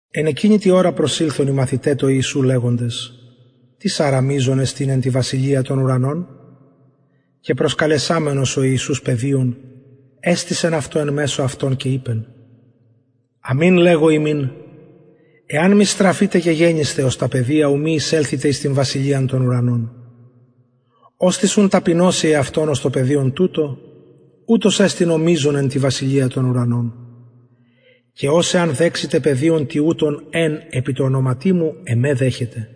εν εκεινη τη ωρα προσηλθον οι μαθηται τω ιησου λεγοντες τις αρα μειζων εστιν εν τη βασιλεια των ουρανων και προσκαλεσαμενος ο ιησους παιδιον εστησεν αυτο εν μεσω αυτων και ειπεν αμην λεγω υμιν εαν μη στραφητε και γενησθε ως τα παιδια ου μη εισελθητε εις την βασιλειαν των ουρανων οστις ουν ταπεινωσει εαυτον ως το παιδιον τουτο ουτος εστιν ο μειζων εν τη βασιλεια των ουρανων και ος εαν δεξηται παιδιον τοιουτον εν επι τω ονοματι μου εμε δεχεται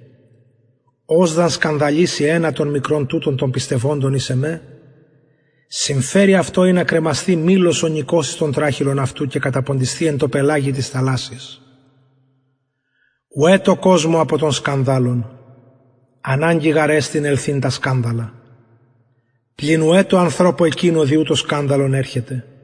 ος δ αν σκανδαλιση ενα των μικρων τουτων των πιστευοντων εις εμε συμφερει αυτω ινα κρεμασθη μυλος ονικος εις τον τραχηλον αυτου και καταποντισθη εν τω πελαγει της θαλασσης ουαι τω κοσμω απο των σκανδαλων αναγκη γαρ εστιν ελθειν τα σκανδαλα πλην ουαι τω ανθρωπω εκεινω δι ου το σκανδαλον ερχεται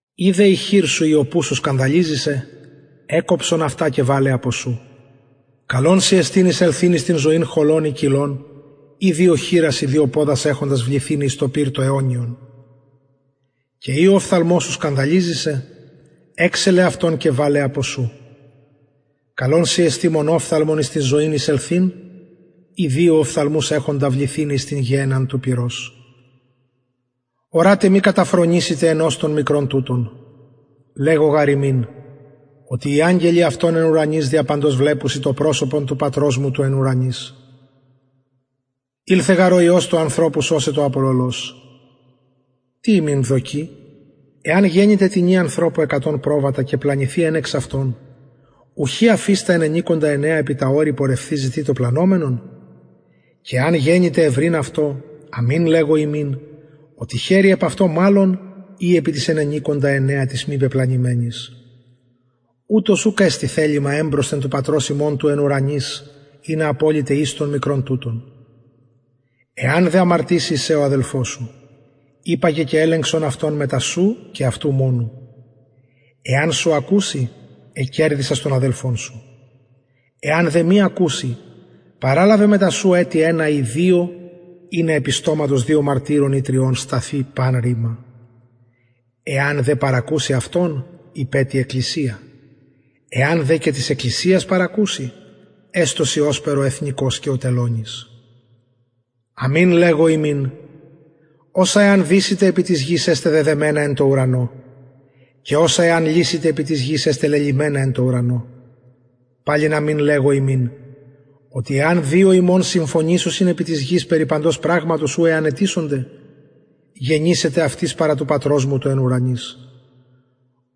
ει δε η χειρ σου η ο πους σου σκανδαλιζει σε εκκοψον αυτα και βαλε απο σου καλον σοι εστιν εισελθειν εις την ζωην χωλον η κυλλον η δυο χειρας η δυο ποδας εχοντα βληθηναι εις το πυρ το αιωνιον και ει ο οφθαλμος σου σκανδαλιζει σε εξελε αυτον και βαλε απο σου καλον σοι εστιν μονοφθαλμον εις την ζωην εισελθειν η δυο οφθαλμους εχοντα βληθηναι εις την γεενναν του πυρος ορατε μη καταφρονησητε ενος των μικρων τουτων λεγω γαρ υμιν οτι οι αγγελοι αυτων εν ουρανοις δια παντος βλεπουσιν το προσωπον του πατρος μου του εν ουρανοις ηλθεν γαρ ο υιος του ανθρωπου σωσαι το απολωλος τι υμιν δοκει εαν γενηται τινι ανθρωπω εκατον προβατα και πλανηθη εν εξ αυτων ουχι αφεις τα ενενηκοντα εννεα επι τα ορη πορευθεις ζητει το πλανωμενον και εαν γενηται ευρειν αυτο αμην λεγω υμιν οτι χαιρει επ αυτω μαλλον η επι τοις ενενηκοντα εννεα τοις μη πεπλανημενοις ουτως ουκ εστιν θελημα εμπροσθεν του πατρος υμων του εν ουρανοις ινα αποληται εις των μικρων τουτων εαν δε αμαρτηση εις σε ο αδελφος σου υπαγε και ελεγξον αυτον μεταξυ σου και αυτου μονου εαν σου ακουση εκερδησας τον αδελφον σου εαν δε μη ακουση παραλαβε μετα σου ετι ενα η δυο ινα επι στοματος δυο μαρτυρων η τριων σταθη παν ρημα εαν δε παρακουση αυτων ειπε τη εκκλησια εαν δε και της εκκλησιας παρακουση εστω σοι ωσπερ ο εθνικος και ο τελωνης αμην λεγω υμιν οσα εαν δησητε επι της γης εσται δεδεμενα εν τω ουρανω και οσα εαν λυσητε επι της γης εσται λελυμενα εν τω ουρανω παλιν αμην λεγω υμιν οτι εαν δυο υμων συμφωνησωσιν επι της γης περι παντος πραγματος ου εαν αιτησωνται γενησεται αυτοις παρα του πατρος μου του εν ουρανοις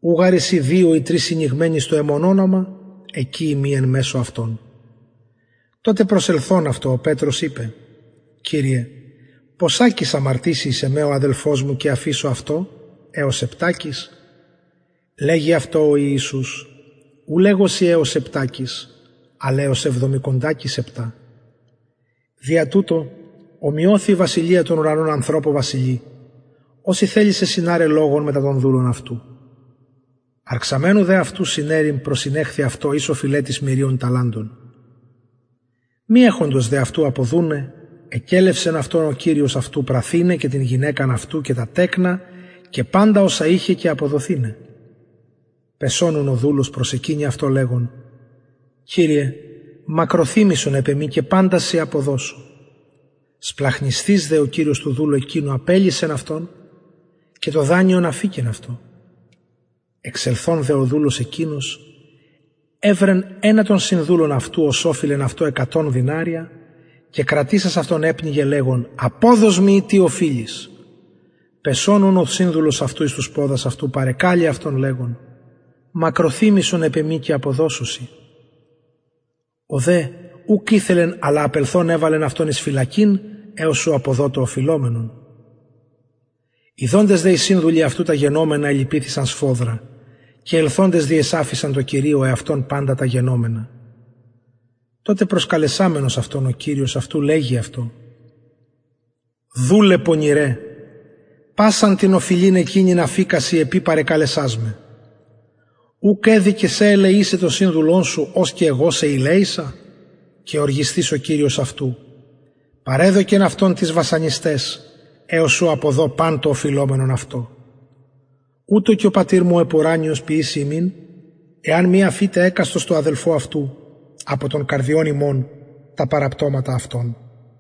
ου γαρ εισιν δυο η τρεις συνηγμενοι εις το εμον ονομα εκει ειμι εν μεσω αυτων τοτε προσελθων αυτω ο πετρος ειπεν κυριε ποσακις αμαρτησει εις εμε ο αδελφος μου και αφησω αυτω εως επτακις λεγει αυτω ο ιησους ου λεγω σοι εως επτακις αλλ εως εβδομηκοντακις επτα δια τουτο ωμοιωθη η βασιλεια των ουρανων ανθρωπω βασιλει ος ηθελησεν συναραι λογον μετα των δουλων αυτου αρξαμενου δε αυτου συναιρειν προσηνεχθη αυτω εις οφειλετης μυριων ταλαντων μη εχοντος δε αυτου αποδουναι εκελευσεν αυτον ο κυριος αυτου πραθηναι και την γυναικα αυτου και τα τεκνα και παντα οσα ειχεν και αποδοθηναι πεσων ουν ο δουλος προσεκυνει αυτω λεγων κυριε μακροθυμησον επ εμοι και παντα σοι αποδωσω σπλαγχνισθεις δε ο κυριος του δουλου εκεινου απελυσεν αυτον και το δανειον αφηκεν αυτω εξελθων δε ο δουλος εκεινος ευρεν ενα των συνδουλων αυτου ος ωφειλεν αυτω εκατον δηναρια και κρατησας αυτον επνιγεν λεγων αποδος μοι ει τι οφειλεις πεσων ουν ο συνδουλος αυτου εις τους ποδας αυτου παρεκαλει αυτον λεγων μακροθυμησον επ εμοι και αποδωσω σοι ο δε ουκ ηθελεν αλλα απελθων εβαλεν αυτον εις φυλακην εως ου αποδω το οφειλομενον ιδοντες δε οι συνδουλοι αυτου τα γενομενα ελυπηθησαν σφοδρα και ελθοντες διεσαφησαν τω κυριω εαυτων παντα τα γενομενα τοτε προσκαλεσαμενος αυτον ο κυριος αυτου λεγει αυτω δουλε πονηρε πασαν την οφειλην εκεινην αφηκα σοι επει παρεκαλεσας με ουκ εδει και σε ελεησαι τον συνδουλον σου ως και εγω σε ηλεησα και οργισθεις ο κυριος αυτου παρεδωκεν αυτον τοις βασανισταις εως ου αποδω παν το οφειλομενον αυτω ουτως και ο πατηρ μου ο επουρανιος ποιησει υμιν εαν μη αφητε εκαστος τω αδελφω αυτου απο των καρδιων υμων τα παραπτωματα αυτων